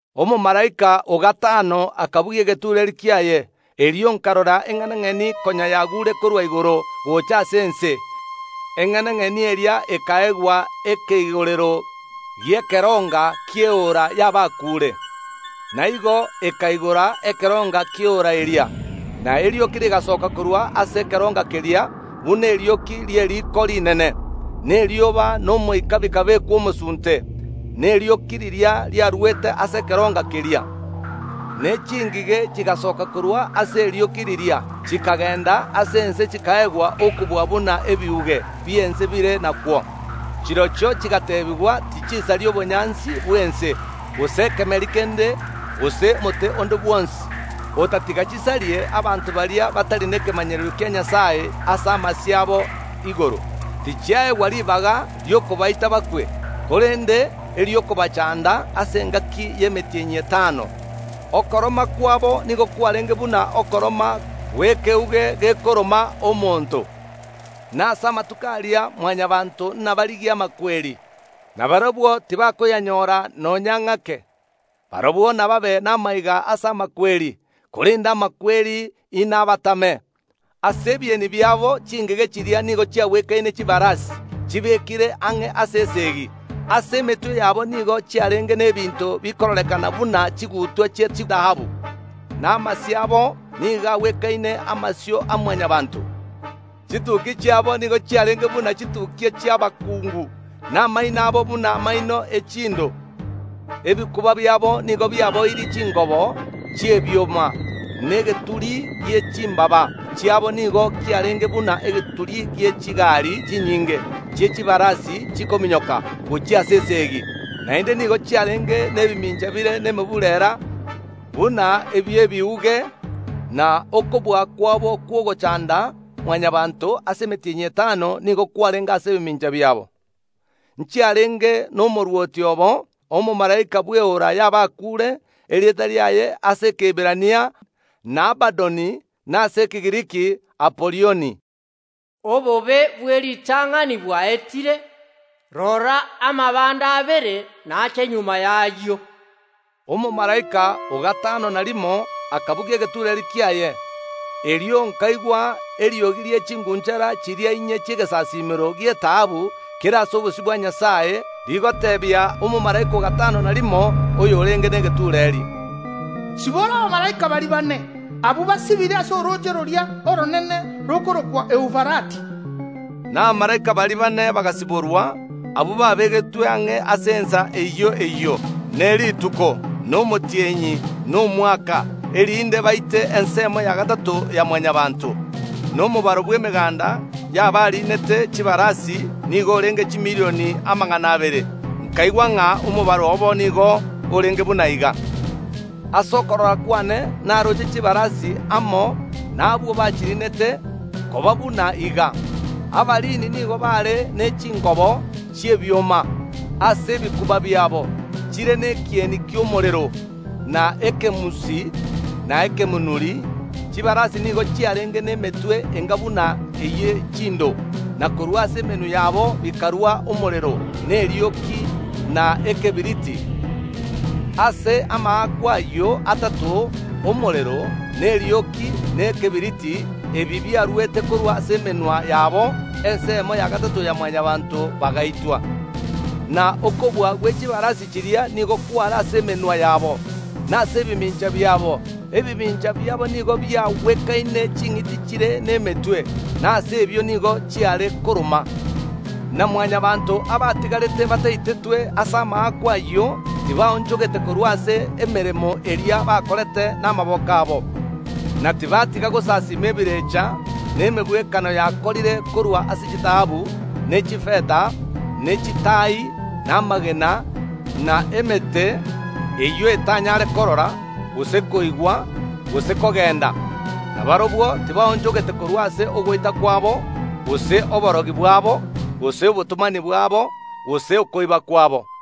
Omomalaika o gatano akabugia egetureeri kiaye. Erio nkarora eng’enang’eni konya yagure korwa igoro gocha ase ense. Eng’enang’eni eria ekaegwa ekeigorero gi’ekeronga ki’eora y’abakuure. Na igo ekaigora ekeronga ki’eora eria, na erioki rigasoka korwa ase ekeronga keria buna erioki ri’eriko rinene, na erioba na omoika bikabekwa omosunte nerioki riria riarwete ase ekeronga keria. Ne chingige chigasoka korwa ase erioki riria, chikagenda ase ense, chikaegwa okobua buna ebiuge bi’ense bire nakwo. Chirochio chigateebigwa tichisaria obonyansi bw’ense, gose kemeri kende, gose mote onde bwonsi, otatiga chisarie abanto baria batari nekemanyererio kia Nyasae ase amasio abo igoro. Tichiaegwa ribaga ri’okobaita bakwe, korende eri’okobachanda ase engaki y’emetienyi etano. Okoroma kwabo nigo kwarenge buna okoroma gw’riagaga gekoroma omonto. Na ase amatuko aria Mwanyabaanto nabarigie amakweri, na barabwo tibakoyanyora nonya ng’ake. Barabwo nababe namaiga ase amakweri, korende amakweri inabatame. Ase ebieni biabo chingige chiria nigo chiagwekaine chibarasi chibekire ang’e ase esegi. Ase emetwe yabo nigo chiarenge n’ebinto bikororekana buna chigutwa chi’echitaabu, na amasio abo nigo agwekaine amasio a Mwanyabaanto. Chitukia chiabo nigo chiarenge buna chitukia chi’abakungu, na amaino abo buna amaino e chindo. Ebikuba biabo nigo biaboirie chingobo chi’ebioma, na egeturi gie chimbaaba chiabo nigo kiarenge buna egeturi gie chigari chinyinge chi’echibarasi chikominyoka gochia ase esegi. Naende nigo chiarenge nebimincha bire nemeburera buna ebi’ebiuge, na okobua kwabo kw’ogochanda Mwanyabaanto ase emetienyi etano nigo kwarenge ase ebimincha biabo. Nchiarenge nomorwoti obo, omomalaika bw’eora y’abakuure, erieta riaye ase Ekeiberania n’Abadoni, na ase Ekegiriki Apolioni. Obobe bw’eritang’ani bwaetire; rora, amabe ande abere nache magega y’ayio. Omomalaika o gatano na rimo akabugia egetureeri kiaye. Erio nkaigwa eriogi rie ching’unchara chiria inye chi’egesasiimero gi’etaabu kere ase obosio bwa Nyasae, rigoteebia omomalaika o gatano na rimo, oyorenge negetureeri, “Sibora abamalaika baria baane, abwo basibire ase orooche roria oronene rokorokwa Eufarati.” Na abamalaika baria baane bagasiborwa, abwo babegetwe ang’e ase ensa eyio eyio, ne rituko, na omotienyi, na omwaka, erinde baite ensemo ya gatato ya Mwanyabaanto. Na omobaro bw’emeganda y’abariinete chibarasi nigo orenge chimilion amagana abere. Nkaigwa ng’a omobaro obo nigo orenge buna iga. Ase okorora kwane naroche chibarasi amo nabwo bachiriinete koba buna iga: Abariini nigo baare ne chingobo chi’ebioma ase ebikuba biabo chire nekieni ki’omorero, na ekemunsi, na ekemonuri. Chibarasi nigo chiarenge nemetwe enga buna eye chindo, na korwa ase emenwa yabo bikarua omorero, na erioki, na ekebiriti. Ase amaakwa, ayio atato, omorero, na erioki, na ekebiriti, ebi biaruete korwa ase emenwa yabo, ensemo ya gatato ya Mwanyabaanto bagaitwa. Na okobua gwe chibarasi chiria nigo kware ase emenwa yabo, na ase ebimincha biabo. Ebimincha biabo nigo biagwekaine ching’iti chire nemetwe, na ase ebio nigo chiare koroma. Na Mwanyabaanto abatigarete bataitetwe ase amaakwa ayio tibaonchogete korwa ase emeremo eria bakorete namaboko abo, na tibatiga gosasiima ebirecha na emegwekano yakorire korwa ase chitaabu, ne chifeta, ne chitaai, na amagena, na emete, eyio etanyare korora, gose koigwa, gose kogenda. Na barabwo tibaonchogete korwa ase ogoita kwabo, gose oborogi bwabo, gose obotomani bwabo, gose okoiba kwabo.